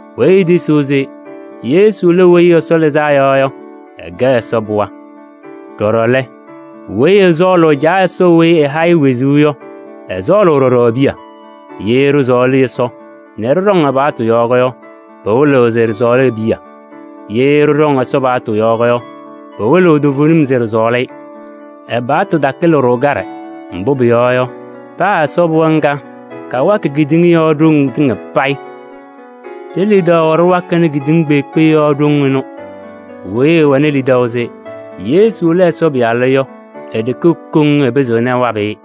Weyi etisiɣ se Yesu lɛ Weyi Ɛsɔ Lɩzaa Yɔ yɔ, ɛkɛ Ɛsɔ pɩɣa. Ɖɔɖɔ lɛ, weyi ɛsɔɔlʋʋ Caa Ɛsɔ weyi ɛha-ɩ wezuu yɔ, ɛsɔɔlʋʋ ɖɔɖɔ e-piya. Ye ɖɩsɔɔlɩ Ɛsɔ nɛ ɖɩɖɔŋ ɛ-paɣtʋ yɔɔ yɔ, pɩwɩlɩɣ se ɖɩsɔɔlɩ e-piya. Ye ɖɩɖɔŋ Ɛsɔ paɣtʋ yɔɔ yɔ, pɩwɩlɩɣ toovenim se ɖɩsɔɔlɩ-ɩ. Ɛ-paɣtʋ takɩlɩ-ɖʋ kaɖɛ, mbʋ pʋyɔɔ yɔ, paa Ɛsɔ pɩɣa ŋga kawakɩ kedeŋa yɔɔ ɖoŋ tɩŋa payɩ. Ɖe-lidaʋ ɖɩwakɩnɩ kedeŋa kpeekpe yɔɔ ɖoŋ ɩnʋ. Weyi ɛwɛnɩ lidaʋ se Yesu lɛ Ɛsɔ Pɩyalʋ yɔ, e-ɖeke koŋ ɛpɩzɩɣnɩ ɛwabɩ-ɩ.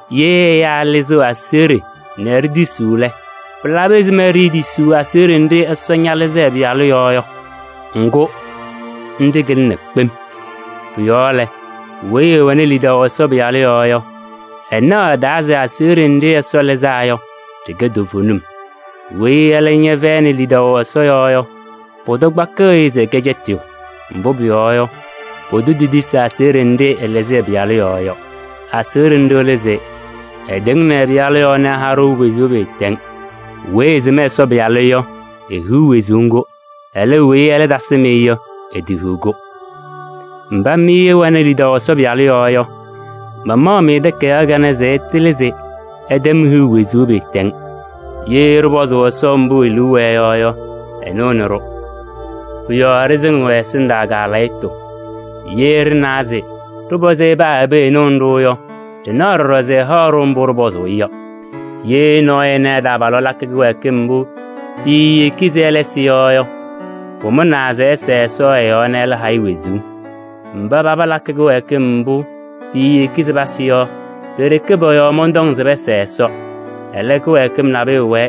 Ye ɛyaa ɛlɩzɩɣ aseɣɖe nɛ ɖitisiɣ lɛ, pɩlabɩ ɛzɩma ɖiitisiɣ aseɣɖe nɖɩ Ɛsɔ ñalɩzɩ ɛ-Pɩyalʋ yɔɔ yɔ? Ŋgʋ nɖɩ kɩlɩna kpem. Pʋ-yɔɔ lɛ, weyi ɛwɛnɩ lidaʋ Ɛsɔ Pɩyalʋ yɔɔ yɔ, ɛnaɣ ɛ-taa se aseɣɖe nɖɩ Ɛsɔ lɩzaa yɔ, ɖɩkɛ toovenim. Weyi ɛlɛ ñɛfɛyɩnɩ lidaʋ Ɛsɔ yɔɔ yɔ, pʋdʋ kpakɩɣ-ɩ se ɛkɛ cɛtɩyʋ. Mbʋ pʋyɔɔ yɔ, pʋdʋ tetisi aseɣɖe nɖɩ ɛlɩzɩ ɛ-Pɩyalʋ yɔɔ yɔ. Aseɣɖe nɖɩ lɛ se: ɛtɩŋnɩ ɛ-Pɩyalʋ yɔɔ nɛ ɛha-ɖʋ wezuu pɩɩtɛŋ. Weyi ɛsɩm Ɛsɔ Pɩyalʋ yɔ, ehiɣ wezuu ŋgʋ. Ɛlɛ, weyi ɛlɛ tasɩm-ɩ yɔ, etehiɣ-kʋ. Mba mɩ ɩwɛnɩ lidaʋ Ɛsɔ Pɩyalʋ yɔɔ yɔ, mama-mɩ takayaɣ kanɛ se ɩtɩlɩ se ɩtɛm hiɣu wezuu pɩɩtɛŋ. Ye ɖɩpɔzʋʋ Ɛsɔ mbʋ e-liu wɛɛ yɔ yɔ, ɛnɩɣnɩ-ɖʋ. Pʋ-yɔɔ ɖɩsɩŋɩɣ ɛ-ɛsɩndaa kaalɛyɩtʋ. Ye ɖɩnawa se ɖɩpɔzɩ-ɩ paa ɛbɛ ɛnɩɣnɩ-ɖʋ yɔ, ɖɩnaɣ ɖɔɖɔ se ɛhaɣ-ɖʋ mbʋ ɖɩpɔzʋʋ-ɩ yɔ. Ye nɔɔyʋ ɛna ɛ-taabalʋ lakɩ kɩwɛɛkɩm mbʋ piiyeki se ɛlɛ ɛsɩ yɔ yɔ, pʋmʋnaa se ɛsɛɛ Ɛsɔ ɛ-yɔɔ nɛ ɛlɛ ha-ɩ wezuu. Mba palakɩ kɩwɛɛkɩm mbʋ piiyeki se pasɩ yɔ, pe-ɖeke pɔ-yɔɔ mɔntɔŋ se pɛsɛɛ Ɛsɔ. Ɛlɛ, kɩwɛɛkɩm nabʋyʋ wɛɛ,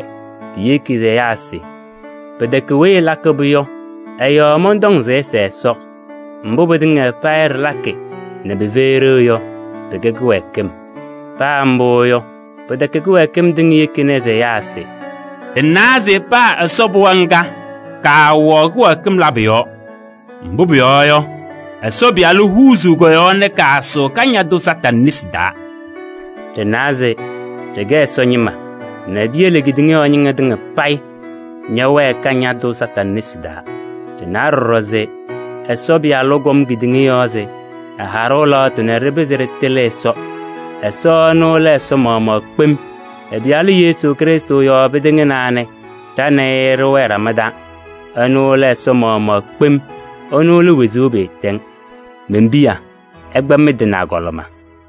piyeki se ɛyaa ɛsɩ. Pɩtɛkɛ weyi ɛlakɩ-pʋ yɔ ɛ-yɔɔ mɔntɔŋ se ɩsɛɛ Ɛsɔ. Mbʋ pɩtɩŋa payɩ ɖɩlakɩ nɛ pɩfɛyɩ ɖeu yɔ, pɩkɛ kɩwɛɛkɩm. Paa mbʋ yɔ, pɩtɛkɛ kɩwɛɛkɩm tɩŋa yekini se ɛyaa ɛsɩ. Ɖɩnawa se paa Ɛsɔ pɩɣa ŋga, kaawɛɣ kɩwɛɛkɩm labʋ yɔɔ. Mbʋ pʋyɔɔ yɔ, Ɛsɔ Pɩyalʋ huuzuu kɔ-yɔɔ nɛ kaasʋʋ Kañadʋ Satanɩ nesi taa. Ɖɩnawa se ɖɩkɛ Ɛsɔ ñɩma nɛ piyele kedeŋa ñɩma tɩŋa payɩ ñɛwɛɛ Kañadʋ Satanɩ nesi taa. Ɖɩnawa ɖɔɖɔ se Ɛsɔ Pɩyalʋ kɔm kedeŋa yɔɔ nɛ ɛha-ɖʋ lɛɣtʋ se ɖɩpɩzɩ ɖɩtɩlɩ Ɛsɔ. Ɛsɔ ɛnʋ lɛ Ɛsɔ maɣmaɣ kpem. Ɛ-Pɩyalʋ Yesu Krɩstʋ yɔɔ pɩtɩŋnaa nɛ ɖa nɛ ɩ ɖɩwɛɛ ɖama taa. Ɛnʋ lɛ Ɛsɔ maɣmaɣ kpem, ɛnʋ lɛ wezuu pɩɩtɛŋ. Men-piya! Ɩkpa mɩ-tɩ nɛ agɔlɩma!